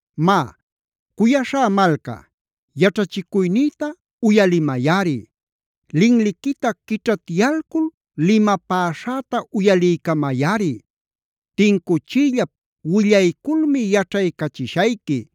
Má, cuyaśhá malca, yaćhachicuynïta uyalimayꞌari. Linliquita quićhatyalcul limapäśhäta uyaliycamayꞌari. Tincuchiyllap willayculmi yaćhaycachishayqui.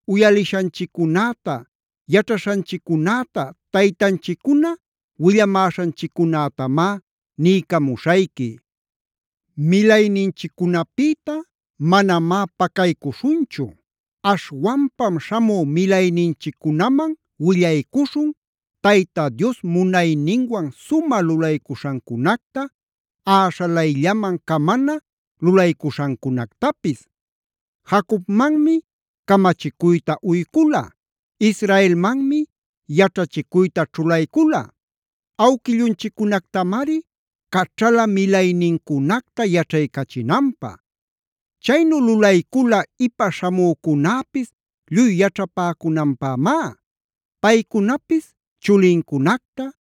Uyalishanchiccunäta, yaćhaśhanchiccunäta, taytanchiccuna willamäśhanchiccunätamá niycamuśhayqui. Milayninchiccunapïta manamá pacaycuśhunchu. Aśhwanpam śhamü milayninchiccunaman willaycuśhun, Tayta Dios munayninwan sumä lulaycuśhancunacta, äśhalayllaman camana lulaycuśhancunactapis. Jacobmanmi camachicuyta uycula, Israelmanmi yaćhachicuyta ćhulaycula. Awquillunchiccunactamari caćhala milaynincunacta yaćhaycachinanpä. Chaynu lulaycula ipa śhamücunäpis lluy yaćhapäcunanpämá. Paycunapis chulincunacta,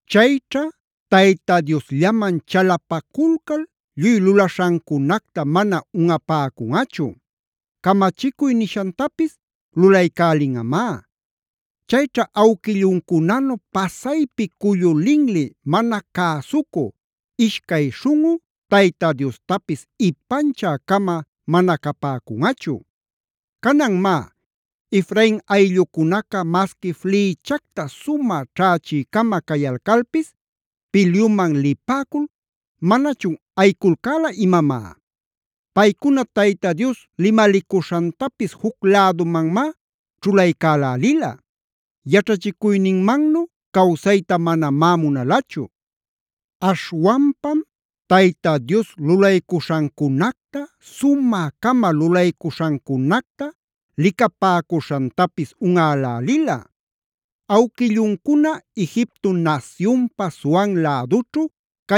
Chayćha Tayta Diosllaman chalapaculcal lluy lulaśhancunacta mana unꞌapäcunꞌachu. Camachicuy nishantapis lulaycälinꞌamá. Chayćha awquilluncunanu pasaypi cullu linli, mana cäsucü, ishcay śhunꞌu, Tayta Diostapis ipanchä-cama mana capäcunꞌachu. Canan má, Efrain ayllucunaca masqui flïchacta sumä ćhächï-cama cayalcalpis pilyuman lipäcul, ¿manachun ayiculcäla imamá? Paycuna, Tayta Dios limalicuśhantapis juc lädumanmá ćhulaycälälila. Yaćhachicuyninmannu cawsayta manamá munalachu. Aśhwanpam Tayta Dios lulaycuśhancunacta, sumä-cama lulaycuśhancunacta licapäcuśhantapis unꞌälälila. Awquilluncuna Egipto nasyunpa Zoan lädućhu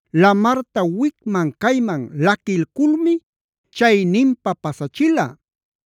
Lamarta wicman-cayman laquilculmi chayninpa pasachila.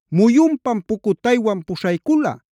Muyunpam pucutaywan puśhaycula,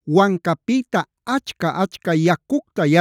Wancapïta achca-achca yacucta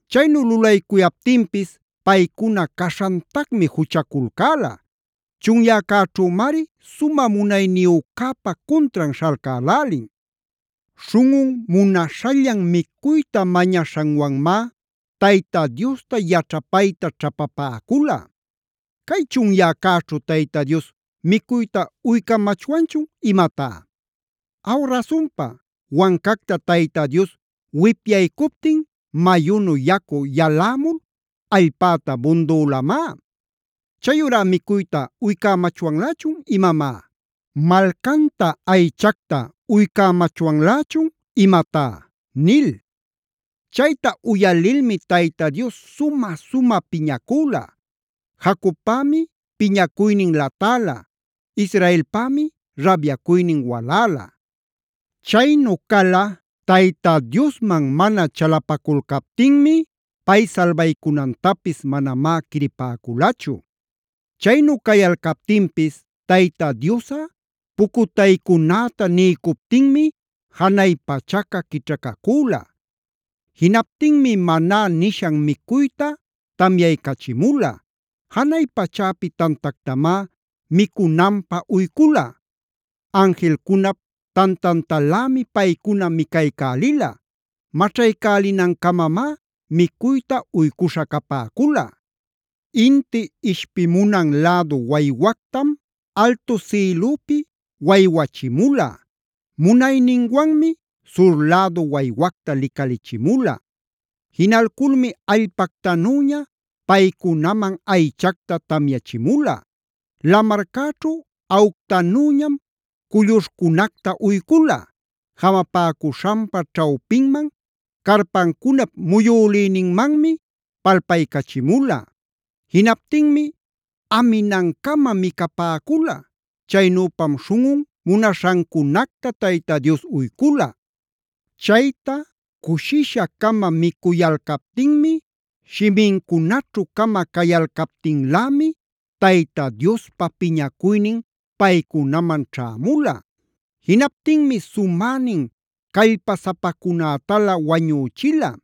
Chaynu lulaycuyaptinpis paycuna caśhantacmi juchaculcäla. Chunyäcäćhümari sumä munayniyücäpa cuntran śhalcälälin. Śhunꞌun munaśhallan micuyta mañaśhanwanmá Tayta Diosta yaćhapayta ćhapapäcula: “¿¡Cay chunyäcäćhu Tayta Dios micuyta uycamachwanchun imatá!? Aw rasunpa, wancacta Tayta Dios wipyaycuptin mayunu yacu yalämul allpäta bundülamá. Chayurá ¿micuyta uycämachwanlächun imamá? ¿Malcanta aychacta uycamachwanlächun imatá?” nil. Chayta uyalilmi Tayta Dios sumä piñacüla. Jacobpämi piñacuynin latäla, Israelpämi rabyacuynin waläla. Chaynu cala Tayta Diosman mana chalapaculcaptinmi, pay salbaycunantapis manamá quiripäculachu. Chaynu cayalcaptinpis Tayta Diosꞌa pucutaycunäta niycuptinmi janay pachaca quićhacacüla. Jinaptinmi Maná nishan micuyta tamyaycachimula. Janay pachäpi tantactamág micunanpä uycula. Anjilcunap tantantalämi paycuna micaycälila. Maćhaycälinancamamá micuyta uycuśha capäcula. Inti ishpimunan lädu waywactam altu sïlüpi waywachimula. Munayninwanmi sur lädu waywacta licalichimula. Jinalculmi allpactanüña paycunaman aychacta tamyachimula. Lamarćhu aꞌuctanüñam culluśhcunactah uycula. Jamapäcuśhanpa ćhawpinman, carpancunap muyülïninmanmi palpaycachimula. Jinaptinmi aminancama micapäcula. Chaynüpam śhunꞌun munaśhancunacta Tayta Dios uycula. Chayta cushisha-cama micuyalcaptinmi, shimincunaćhu-cama cayalcaptinlämi, Tayta Diospa piñacuynin paycunaman ćhämula. Jinaptinmi sumänin callpasapacunätalä wañüchila.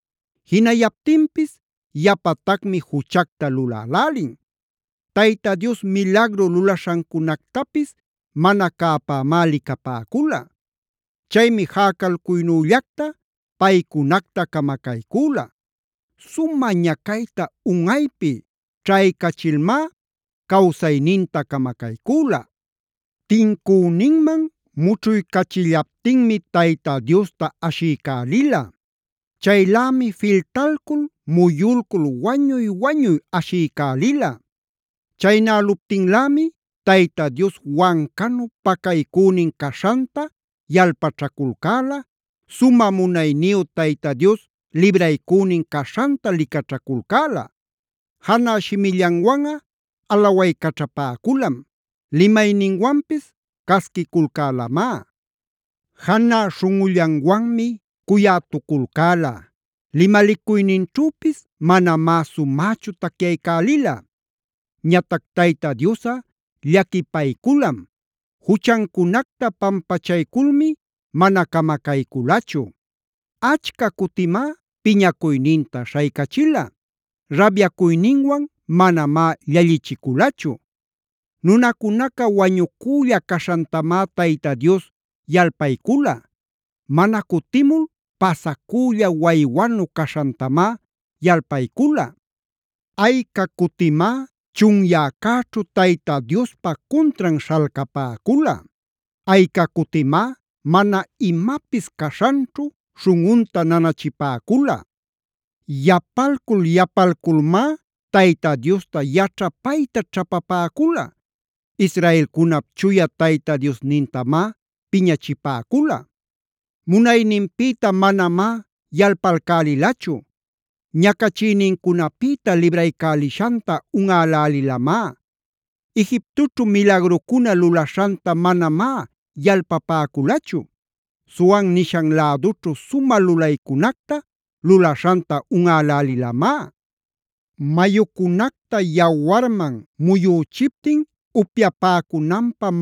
Jinayaptinpis yapatacmi juchacta lulälälin. Tayta Dios milagru lulaśhancunactapis mana cäpämá licapäcula. Chaymi jäcalcuynüllacta paycunacta camacaycüla. Sumä ñacayta unꞌaypi ćhaycachilmá cawsayninta camacaycüla. Tincüninman mućhuycachillaptinmi Tayta Diosta ashiycälila. Chaylämi filtalcul muyulcul wañuy-wañuy ashiycälila. Chaynäluptinlämi Tayta Dios wancanu pacaycünin caśhanta yalpaćhaculcäla, sumä munayniyu Tayta Dios libraycünin caśhanta licaćhaculcäla. Janä shimillanwanꞌa alawaycaćhapäculam. Limayninwanpis casquiculcälamá. Janä śhunꞌullanwanmi cuyätuculcäla.j Limalicuyninćhüpis manamá sumächu tacyaycälila. Ñatac Tayta Diosꞌa llaquipayculam. Juchancunacta pampachayculmi mana camacayculachu. Achca cutimá piñacuyninta śhaycachila. Rabyacuyninwan manamá llallichiculachu. Nunacunaca wañucülla caśhantamá Tayta Dios yalpaycula. Mana cutimul pasacülla waywanu caśhantamá yalpaycula. Ayca cutimá chunyäcäćhu Tayta Diospa cuntran śhalcapäcula. Ayca cutimá mana imapis caśhanćhu śhunꞌunta nanachipäcula. Yapalcul-yapalculmá Tayta Diosta yaćhapayta ćhapapäcula. Israelcunap Chuya Tayta Diosnintamá piñachipäcula. Munayninpïta manamá yalpalcälilachu. Ñacachïnincunapïta libraycälishanta unꞌälälilamá. Egiptoćhu milagrucuna lulaśhanta manamá yalpapäculachu. Zoan nishan lädućhu sumä lulaycunacta lulaśhanta unꞌälälilamá. Mayucunacta yawarman muyüchiptin upyapäcunanpä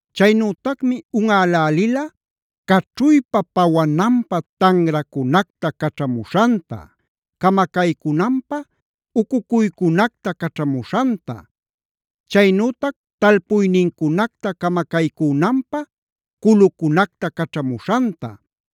Chaynütacmi unꞌälälila caćhuypa pawananpä tanracunactal caćhamuśhanta, camacaycunanpä ucucuycunactanm caćhamuśhanta, chaynütac talpuynincunacta camacaycünanpä culucunacta caćhamuśhanta,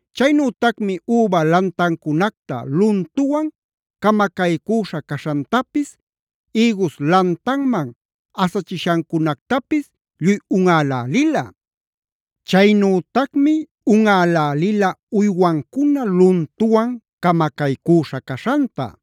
Chaynütacmi üba lantancunacta luntuwan camacaycüśha caśhantapis, ïgus lantanman asachishancunactapis lluy unꞌälälila. Chaynütacmi unꞌälälila uywancuna luntuwan camacaycüśha caśhanta,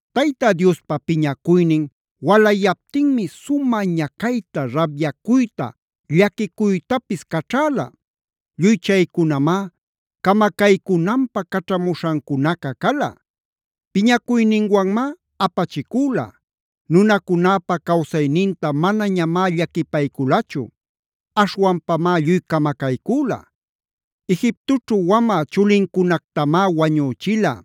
Tayta Diospa piñacuynin walayaptinmi sumä ñacayta, rabyacuyta, llaquicuytapis caćhäla. Lluy chaycunamá camacaycunanpä caćhamuśhancunaca cala. Piñacuyninwanmá apachicüla; nunacunäpa cawsayninta manañamá llaquipayculachu. Aśhwanpamá lluy camacaycüla. Egiptoćhu wamä chulincunactamá wañüchila.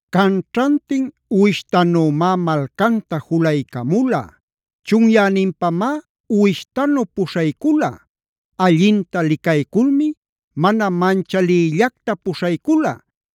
Canćhantin uwishtanümá malcanta julaycamula.r Chunyäninpamá uwishtanu puśhaycula. Allinta licayculmi mana manchalïllacta puśhaycula.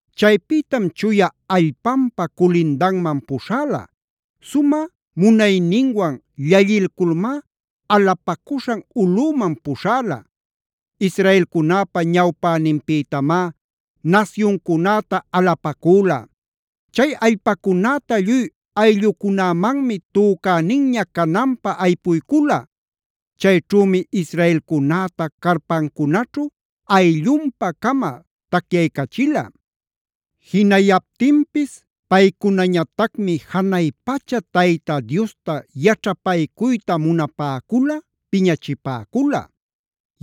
Chaypïtam chuya allpanpa culindanman puśhäla.t Sumä munayninwan llallilculmá alapacuśhan ulꞌüman puśhäla. Israelcunäpa ñawpäninpïtamá nasyuncunäta alapacüla.u Chay allpacunäta lluy ayllucunämanmi tücäninña cananpä aypuycula. Chayćhümi israelcunäta carpancunaćhu ayllunpa-cama tacyaycachila. Jinayaptinpis paycunañatacmi janay pacha Tayta Diosta yaćhapaycuyta munapäculav piñachipäcula.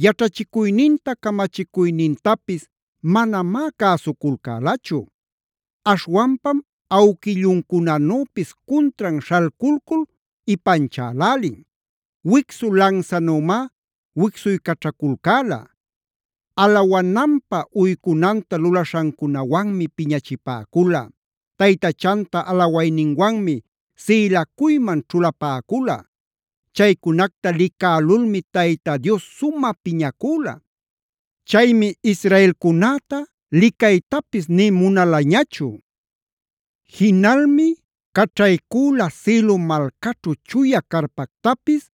Yaćhachicuyninta, camachicuynintapis manamá cäsuculcälachu. Aśhwanpam awquilluncunanüpis cuntran śhalculcul ipanchälälin. Wicsu lansanümá wicsuycaćhaculcäla. Alawananpä uycunanta lulaśhancunawanmi piñachipäcula. Taytachanta alawayninwanmi sïlacuyman ćhulapäcula. Chaycunacta licälulmi Tayta Dios sumä piñacüla. Chaymi israelcunäta licaytapis nï munalañachu. Jinalmi caćhaycüla Silo malcaćhu chuya carpactapis,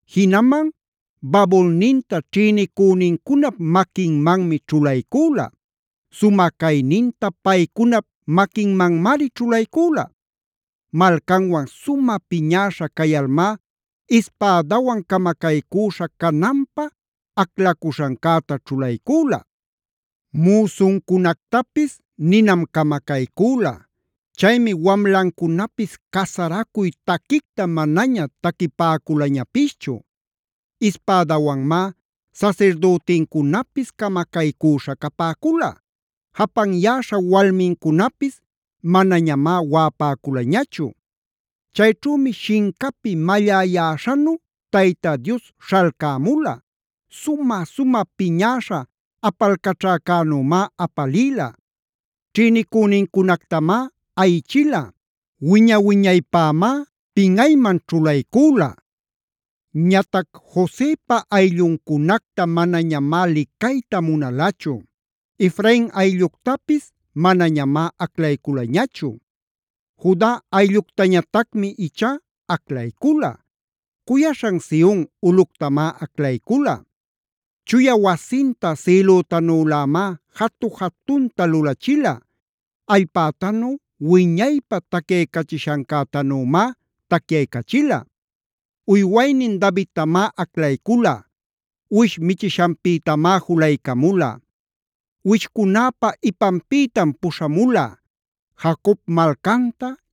Jinaman babulninta ćhïnicünincunap maquinmanmi ćhulaycüla.x Sumä cayninta paycunap maquinmanmari ćhulaycüla. Malcanwan sumä piñäśha cayalmá ispädawan camacaycüśha cananpä aclacuśhancäta ćhulaycüla. Müsuncunactapisy ninam camacaycüla. Chaymi wamlancunapis casaracuy taquicta manaña taquipäculañapischu. Ispädawanmá sasirdütincunapis camacaycüśha capäcula. Japanyäśha walmincunapis manañamá waꞌapäculañachu. Chayćhümi shincapi malläyäśhanu Tayta Dios śhalcämula. Sumä-sumä piñäśha apalcaćhäcänümá apalïla. Ćhïnicünincunactamá ayichila. Wiña-wiñaypämá pinꞌayman ćhulaycüla. Ñatac Josepa aylluncunacta manañamá licayta munalachu. Efrain aylluctapis manañamá aclayculañachu. Juda aylluctañatacmi ichá aclaycula. Cuyaśhan Sion ulꞌuctamá aclaycula. Chuya wasinta sïlütanülämá jatu-jatunta lulachila. Allpätanu wiñaypä tacyaycachishancätanümá tacyaycachila. Uywaynin Davidtamá aclaycula. Uwish michishanpïtamá julaycamula. Uwishcunäpa ipanpïtam puśhamula. Jacob malcanta,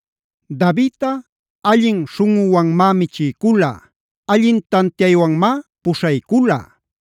Davidꞌa allin śhunꞌuwanmá michiycula. Allin tantiaywanmá puśhaycula.